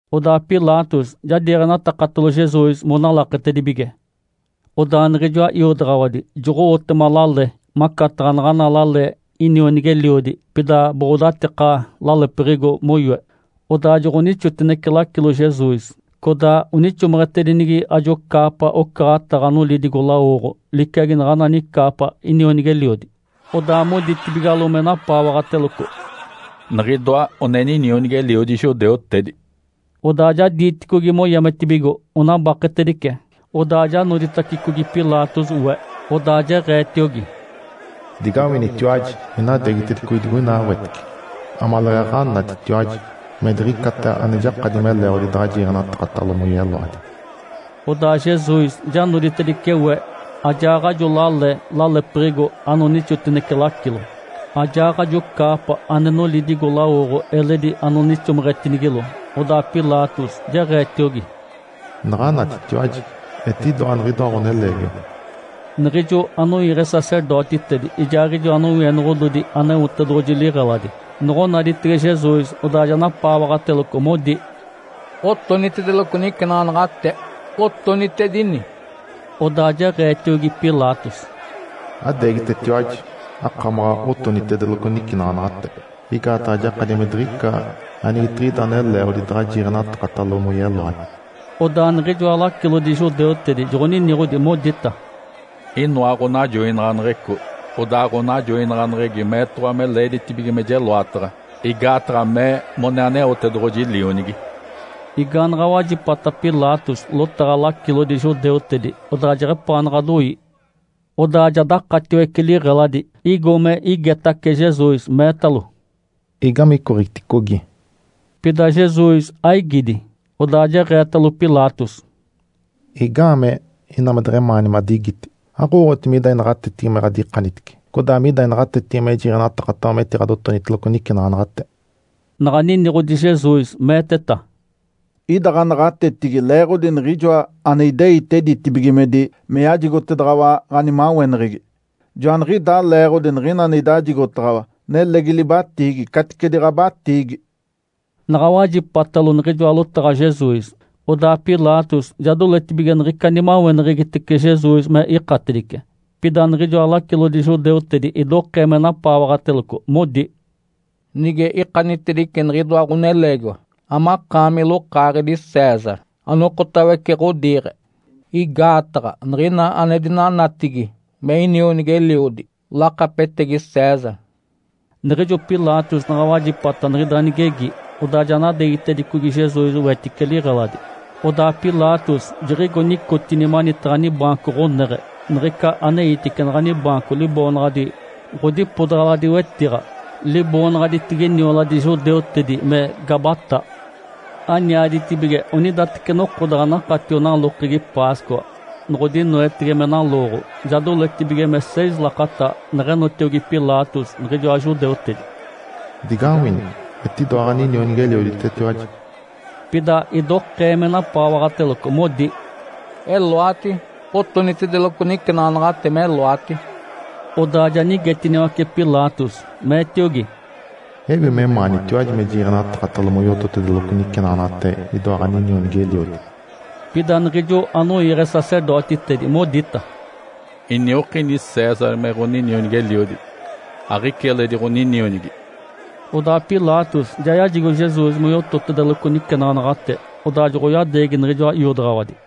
Odaa Pilatos ja diiɡ̶enatakatalo Jesus monalaketedibige. Odaa niɡ̶ijoa iodaɡ̶awadi joɡ̶oyoetema lale, macataɡ̶a naɡ̶ana lale inionigi-eliodi, pida boɡ̶odatika lalepiɡ̶igo moyoe. Odaa joɡ̶onixotinece lacilo Jesus, codaa onixomeɡ̶etedinigi ajo caapa ocaɡ̶ataɡ̶a nolidigo-lawoɡ̶o liciagi naɡ̶ana nicaapa inionigi-eliodi. Odaa moditibigalo me napaawaɡ̶ateloco, “Niɡ̶idoa ninionigi-eliodi judeutedi!” Odaa ja diiticogi moyametibigo, onabaketedice. Odaa ja noditacicogi Pilatos we. Odaa jeɡ̶eetiogi, “Digawinitiwaji. Inadeegitedicogi digoina wetice, amaleeɡ̶aɡ̶a anatitiwaji me diɡ̶icata ane jakadi me leeɡ̶odi daɡ̶a jiiɡ̶enatakatalo moyeloadi”. Odaa Jesus ja noditedice we ajaaɡ̶ajo lale lalepiɡ̶igo anonixotinece lacilo, ajaaɡ̶ajo caapa ane nolidigo-lawoɡ̶o eledi anonixomeɡ̶etinigilo. Odaa Pilatos jeɡ̶eetiogi, “Naɡ̶anatitiwaji! Etidoa niɡ̶idoa ɡ̶oneleegiwa!” Niɡ̶ijo anoiiɡ̶e sacerdotitedi ijaaɡ̶ijoa nowienoɡ̶ododi Aneotedoɡ̶oji liɡ̶eladi noɡ̶onaditege Jesus, odaa ja napaawaɡ̶ateloco, modi, “Otonitedeloco nicenaɡ̶anaɡ̶ate! Otonitedini!” Odaa jeɡ̶eetiogi Pilatos, “Adeegitetiwaji, akamaɡ̶a otonitedeloco nicenaɡ̶anaɡ̶ate. Igaataɡ̶a jakadi me diɡ̶ica anigetiɡ̶ida ane leeɡ̶odi daɡ̶a jiiɡ̶enatakatalo moyeloadi”. Odaa niɡ̶ijoa lacilodi judeutedi joɡ̶oniniɡ̶odi, modita, “Inoa ɡ̶onajoinaɡ̶aneɡ̶eco. Odaa ɡ̶onajoinaɡ̶aneɡ̶egi meetoɡ̶owa me leeditibige me jeloataɡ̶a, igaataɡ̶a mee mone Aneotedoɡ̶oji Lionigi”. Igaanaɡ̶a wajipata Pilatos lotaɡ̶a lacilodi judeutedi, odaa jeɡ̶epaanaɡ̶a doi. Odaa ja dakataciwece liɡ̶eladi, igo me igetace Jesus, meetalo, “Igame icoɡ̶iticogi?” Pida Jesus aigidi. Odaa jeɡ̶eetalo Pilatos, “Igaamee ina me deɡ̶emaani madigiti? Aɡ̶owooɡ̶oti mida inaɡ̶atetigi me ɡ̶adikanitice, codaa mida inaɡ̶atetigi me jiiɡ̶enatakataɡ̶awa metiɡ̶adotoniteloco nicenaɡ̶anaɡ̶ate?” Naɡ̶a niniɡ̶odi Jesus, meeteta, “Ida ɡ̶anaɡ̶atetigi leeɡ̶odi Niɡ̶ijoa ane ideite ditibigimedi me yajigotedaɡ̶awa ɡ̶animaweneɡ̶egi. Joaniɡ̶idaa leeɡ̶odi niɡ̶ina ane idajigotaɡ̶awa nelegi libatiigi caticedi ɡ̶abatiigi.” Naɡ̶a wajipatalo niɡ̶ijoa lotaɡ̶a Jesus, odaa Pilatos ja doletibige niɡ̶ica nimaweneɡ̶egitece Jesus me ikatedice. Pida niɡ̶ijoa lacilodi judeutedi idokee me napaawaɡ̶ateloco, modi, “Nige ikanitedice niɡ̶idoa ɡ̶oneleegiwa, amakaami lokaaɡ̶edi César, anokotawece ɡ̶odiiɡ̶e. Igaataɡ̶a niɡ̶ina ane dinanatigi me inionigi-eliodi, lakapetegi César”. Niɡ̶ijo Pilatos naɡ̶a wajipata niɡ̶ida nigegi, odaa ja nadeegitedicogi Jesus wetice liɡ̶eladi. Odaa Pilatos jiɡ̶igo nicotini manitaɡ̶a nibaanco ɡ̶oneɡ̶e, niɡ̶ica aneitice naɡ̶ani baanco liboonaɡ̶adi “Ǥodipodaɡ̶aladi wetiɡ̶a”. (Liboonaɡ̶aditigi nioladi judeutedi me “Gabatá”.) Aniaditibige onidateci noko daɡ̶a nakatio nalokegi Páscoa, noɡ̶odinoetege me nalooɡ̶o. Ja doletibige me seis lakata, neɡ̶eetiogi Pilatos niɡ̶ijoa judeutedi, “Digawini! Etidoa ɡ̶aninionigi-elioditetiwaji!” Pida idokee me napaawaɡ̶ateloco, modi, “Eloati! Otonitedeloco nicenaɡ̶anaɡ̶ate meloati!” Odaa ja nigetiniwace Pilatos, meetiogi, “Ewi memaanitiwaji me jiiɡ̶enatakatalo moyototedeloco nicenaɡ̶anaɡ̶ate idoa ɡ̶aninionigi-eliodi?” Pida niɡ̶ijo anoiiɡ̶e sacerdotitedi modita, “Iniokini César me ɡ̶oninionigi-eliodi. Aɡ̶ica eledi ɡ̶oninionigi”. Odaa Pilatos ja yajigo Jesus moyototedeloco nicenaɡ̶anaɡ̶ate, odaa joɡ̶oyadeegi niɡ̶ijoa iodaɡ̶awadi.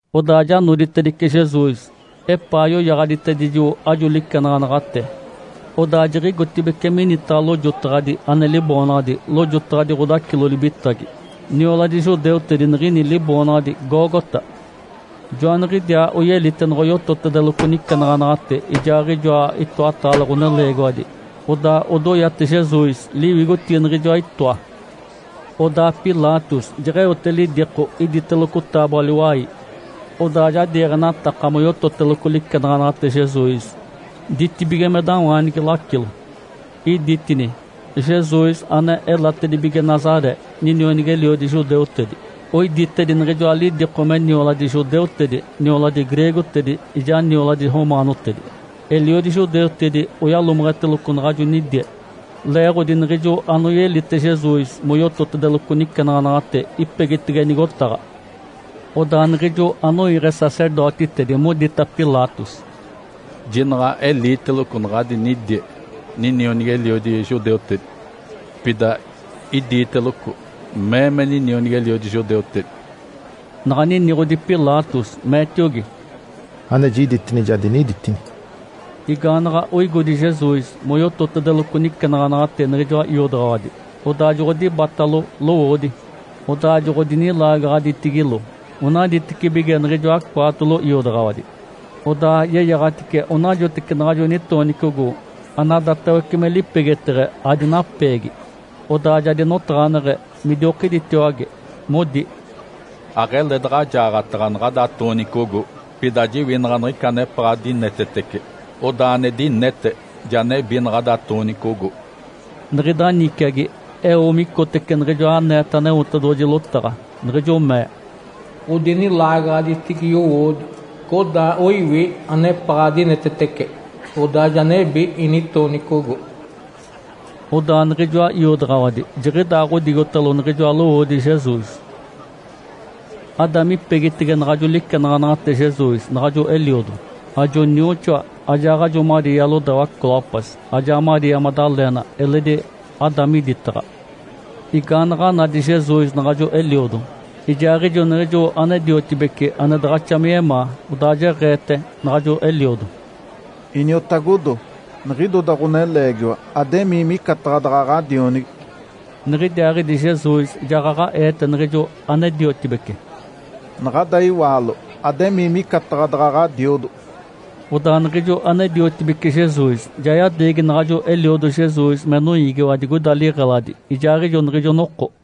Odaa ja noditedice Jesus, epaa yoyaɡ̶aditedijo ajo licenaɡ̶anaɡ̶ate. Odaa jiɡ̶igotibeci minitaɡ̶a lojotaɡ̶adi ane liboonaɡ̶adi “Lojotaɡ̶adi ɡ̶odacilo-libitagi”. (Nioladi judeutedi niɡ̶ini liboonaɡ̶adi “Gólgota”). Joaniɡ̶idiaa oyelite noɡ̶oyototedeloco nicenaɡ̶anaɡ̶ate ijaaɡ̶ijoa itoataale ɡ̶oneleegiwadi. Odaa odoyate Jesus liwigotigi niɡ̶ijoa itoa. Odaa Pilatos jeɡ̶eote lidiko iditeloco taaboa-liwai. Odaa ja diiɡ̶enataka moyototeloco licenaɡ̶anaɡ̶ate Jesus ditibigimedawaanigi lacilo. Iditini, “JESUS ANE ELATEDIBIGE NAZARÉ, NINIONIGI-ELIODI JUDEUTEDI.” Oiditedi niɡ̶ijoa lidiko me nioladi judeutedi, nioladi greegotedi, ijaa nioladi romaanotedi. Eliodi judeutedi oyalomeɡ̶eteloco naɡ̶ajo nidie, leeɡ̶odi niɡ̶ijo anoyelite Jesus moyototedeloco nicenaɡ̶anaɡ̶ate ipegitege nigotaɡ̶a. Odaa niɡ̶ijo anoiiɡ̶e sacerdotitedi modita Pilatos, “Jinaɡ̶a eliiteloco naɡ̶ada nidie ‘Ninionigi-eliodi judeutedi’. Pida idiiteloco ‘Mee me ninionigi-eliodi judeutedi’”. Naɡ̶a niniɡ̶odi Pilatos, meetiogi, “Ane jiditini, ja diniditini.” Igaanaɡ̶a oigodi Jesus moyototedeloco nicenaɡ̶anaɡ̶ate niɡ̶ijoa iodaɡ̶awadi, odaa joɡ̶odibatalo lowoodi, odaa joɡ̶odinilaagaɡ̶aditigilo onaditecibige niɡ̶ijoa cwaatolo iodaɡ̶awadi. Odaa yeyaɡ̶atice onajoteci naɡ̶ajo nitoonicogo, anadatawece me lipegeteɡ̶e adinapeegi. Odaa ja dinotaɡ̶aneɡ̶e, midiokiditiwage, modi, “Aɡ̶ele daɡ̶a jaaɡ̶ataɡ̶a naɡ̶ada toonicogo. Pida jiwinaɡ̶a niɡ̶ica anepaɡ̶a dinetetece. Odaa ane dinete ja nebi naɡ̶ada toonicogo.” Niɡ̶ida niciagi eo micotece niɡ̶ijo aneeta Aneotedoɡ̶oji lotaɡ̶a, niɡ̶ijo mee, “Odinilaagaɡ̶aditigi yowoodi, codaa oiwi anepaɡ̶a dinetetece, odaa ja nebi initoonicogo.” Odaa niɡ̶ijoa iodaɡ̶awadi jiɡ̶idaaɡ̶odigotalo niɡ̶ijoa lowoodi Jesus. Ada mipegitege naɡ̶ajo licenaɡ̶anaɡ̶ate Jesus naɡ̶ajo eliodo, ajo nioxoa, ajaaɡ̶ajo Maria lodawa Clopas, ajaa Maria Madalena eledi ada miditaɡ̶a. Igaanaɡ̶a nadi Jesus naɡ̶ajo eliodo, ijaaɡ̶ijo niɡ̶ijo ane-diotibece ane daɡ̶axa me yemaa, odaa jeɡ̶eete naɡ̶ajo eliodo, “Iniotagodo. Niɡ̶idoda ɡ̶oneleegiwa. Ademii micataɡ̶a daɡ̶a ɡ̶adionigi”. Niɡ̶idiaaɡ̶idi Jesus jaɡ̶aɡ̶a eete niɡ̶ijo ane-diotibece, “Naɡ̶ada iwaalo. Ademii micataɡ̶a daɡ̶a ɡ̶adiodo”. Odaa niɡ̶ijo ane-diotibece Jesus ja yadeegi naɡ̶ajo eliodo Jesus me noiigiwa digoida liɡ̶eladi ijaaɡ̶ijo niɡ̶ijo noko.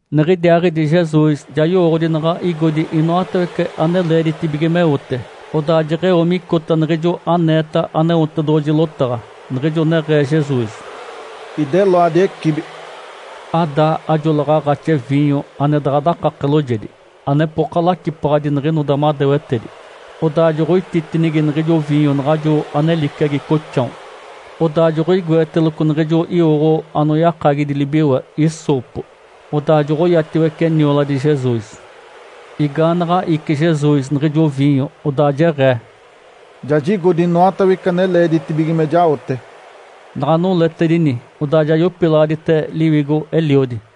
Niɡ̶idiaaɡ̶idi Jesus ja yowooɡ̶odi naɡ̶a igodi inoatawece ane leeditibige meote. Odaa jeɡ̶eo micota niɡ̶ijo aneeta Aneotedoɡ̶oji lotaɡ̶a, niɡ̶ijo neɡ̶ee Jesus, “Ideloadi ecibi”. Ada ajo laɡ̶aaɡ̶axi viinyo ane daɡ̶a dakake loojedi (anepoka lacipaɡ̶adi niɡ̶inoda madewetedi). Odaa joɡ̶oititinigi niɡ̶ijo viinyo naɡ̶ajo ane liciagi coxao. Odaa joɡ̶oigoeteloco niɡ̶ijo iwoɡ̶o anoyakagidi libiwe “hissopo”. Odaa joɡ̶oyatiwece nioladi Jesus. Igaanaɡ̶a ici Jesus niɡ̶ijo viinyo, odaa jeɡ̶ee, “Ja jigodi inoatawece ane leeditibige me jaote.” Naɡ̶a noletedini, odaa ja yopilaɡ̶adite liwigo Eliodi.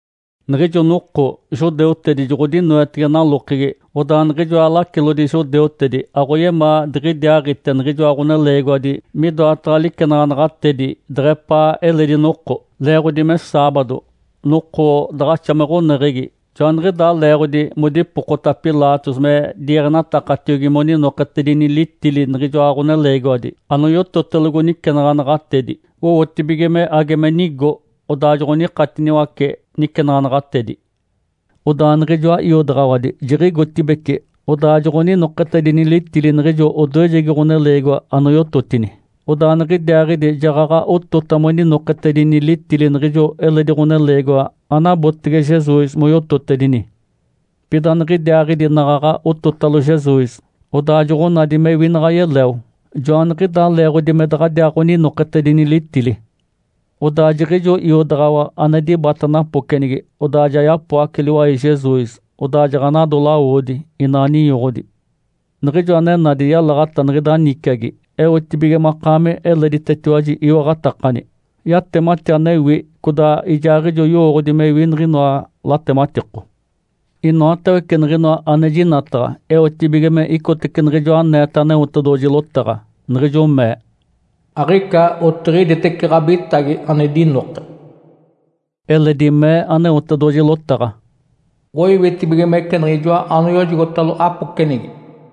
Niɡ̶ijo noko judeutedi joɡ̶odinoetege nalokegi, odaa niɡ̶ijoa lacilodi judeutedi aɡ̶oyemaa diɡ̶idiaaɡ̶ite niɡ̶ijoa ɡ̶oneleegiwadi midoataɡ̶a licenaɡ̶anaɡ̶atedi deɡ̶epaa eledi noko, leeɡ̶odi me saabado, noko daɡ̶axa me ɡ̶oneɡ̶egi. Joaniɡ̶idaa leeɡ̶odi modipokota Pilatos me diiɡ̶enatakatiogi moninoketedini litili niɡ̶ijoa ɡ̶oneleegiwadi anoyototelogo nicenaɡ̶anaɡ̶atedi (owotibige me age me nigo), odaa joɡ̶onikatiniwace nicenaɡ̶anaɡ̶atedi. Odaa niɡ̶ijoa iodaɡ̶awadi jiɡ̶igotibeci, odaa joɡ̶oninoketedini litili niɡ̶ijo odoejegi ɡ̶oneleegiwa anoyototini. Odaa niɡ̶idiaaɡ̶idi jaɡ̶aɡ̶a otota moninoketedini litili niɡ̶ijo eledi ɡ̶oneleegiwa anabotege Jesus moyototedini. Pida niɡ̶idiaaɡ̶idi naɡ̶aɡ̶a ototalo Jesus, odaa joɡ̶onadi mewi naɡ̶a yeleo. Joaniɡ̶idaa leeɡ̶odi me daɡ̶adiaaɡ̶oninoketedini litili. Odaa jiɡ̶ijo iodaɡ̶awa ane dibata napocenigi, odaa ja yapoace liwai Jesus. Odaa jaɡ̶anado lawodi, ina ninyoɡ̶odi. Niɡ̶ijo ane nadi yalaɡ̶ata niɡ̶ida niciagi eotibige makaami eleditetiwaji iwaɡ̶atakani. Yatemati anewi, codaa ijaaɡ̶ijo yowooɡ̶odi mewi niɡ̶inoa latematiko. Inoatawece niɡ̶inoa ane jinataɡ̶a eotibige me icotece niɡ̶ijoa aneeta Aneotedoɡ̶oji lotaɡ̶a, niɡ̶ijo mee, “Aɡ̶ica otiɡ̶iditece ɡ̶abitagi ane dinoke”. Eledi mee Aneotedoɡ̶oji lotaɡ̶a, “Oiwitibigimece niɡ̶ijoa anoyojogotalo apocenigi”.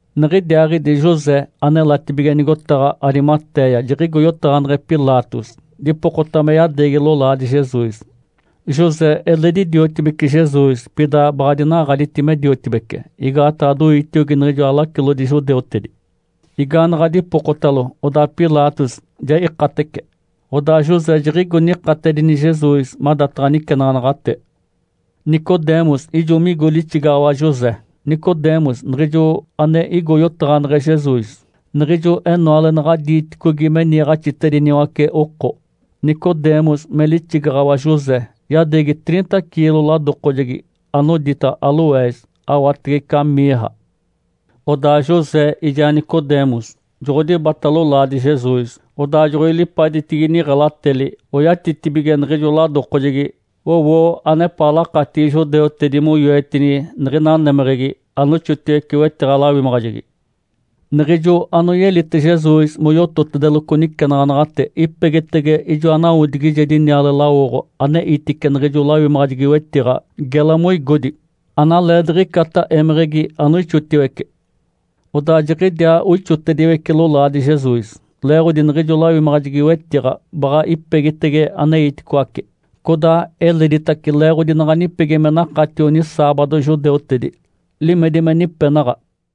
Niɡ̶idiaaɡ̶idi José anelatibige nigotaɡ̶a Arimatéia jiɡ̶igo yotaɡ̶aneɡ̶e Pilatos, dipokota me yadeegi lolaadi Jesus. José eledi diotibece Jesus, pida baɡ̶a dinaɡ̶aditi me diotibece, igaataɡ̶a doitiogi niɡ̶ijoa lacilodi judeutedi. Igaanaɡ̶a dipokotalo, odaa Pilatos ja ikatece. Odaa José jiɡ̶igo nikatedini Jesus madataɡ̶a nicenaɡ̶anaɡ̶ate. Nicodemus ijo migo lixigaɡ̶awa José. Nicodemus, niɡ̶ijo ane igo yotaɡ̶aneɡ̶e Jesus niɡ̶ijo enoale naɡ̶a diiticogi me niiɡ̶axitediniwace oko. Nicodemus me lixigaɡ̶awa José yadeegi triinta ciilo ladokojegi anodita “aloés” awatege ica “mirra”. Odaa José ijaa Nicodemus joɡ̶odibata lolaadi Jesus, odaa joɡ̶oilipaditigi niɡ̶elateli, oyatitibige niɡ̶ijo ladokojegi. Owo anepaa lakatigi judeutedi moyoetini niɡ̶ina némeɡ̶egi anoixotiwece wetiɡ̶a-lawimaɡ̶ajegi. Niɡ̶ijo anoyelite Jesus moyototedeloco nicenaɡ̶anaɡ̶ate ipegitege ijoa nawodigijedi niale lawoɡ̶o aneitice niɡ̶ijo lawimaɡ̶ajegi-wetiɡ̶a gela moigodi, analeediɡ̶icata émeɡ̶egi anoixotiwece. Odaa jiɡ̶idiaa oixotediwece lolaadi Jesus, leeɡ̶odi niɡ̶ijo lawimaɡ̶ajegi-wetiɡ̶a baɡ̶a ipegitege aneiticoace, codaa eleditace leeɡ̶odi naɡ̶a nipegi me nakatio nisaabado judeutedi. (Limedi me nipenaɡ̶a).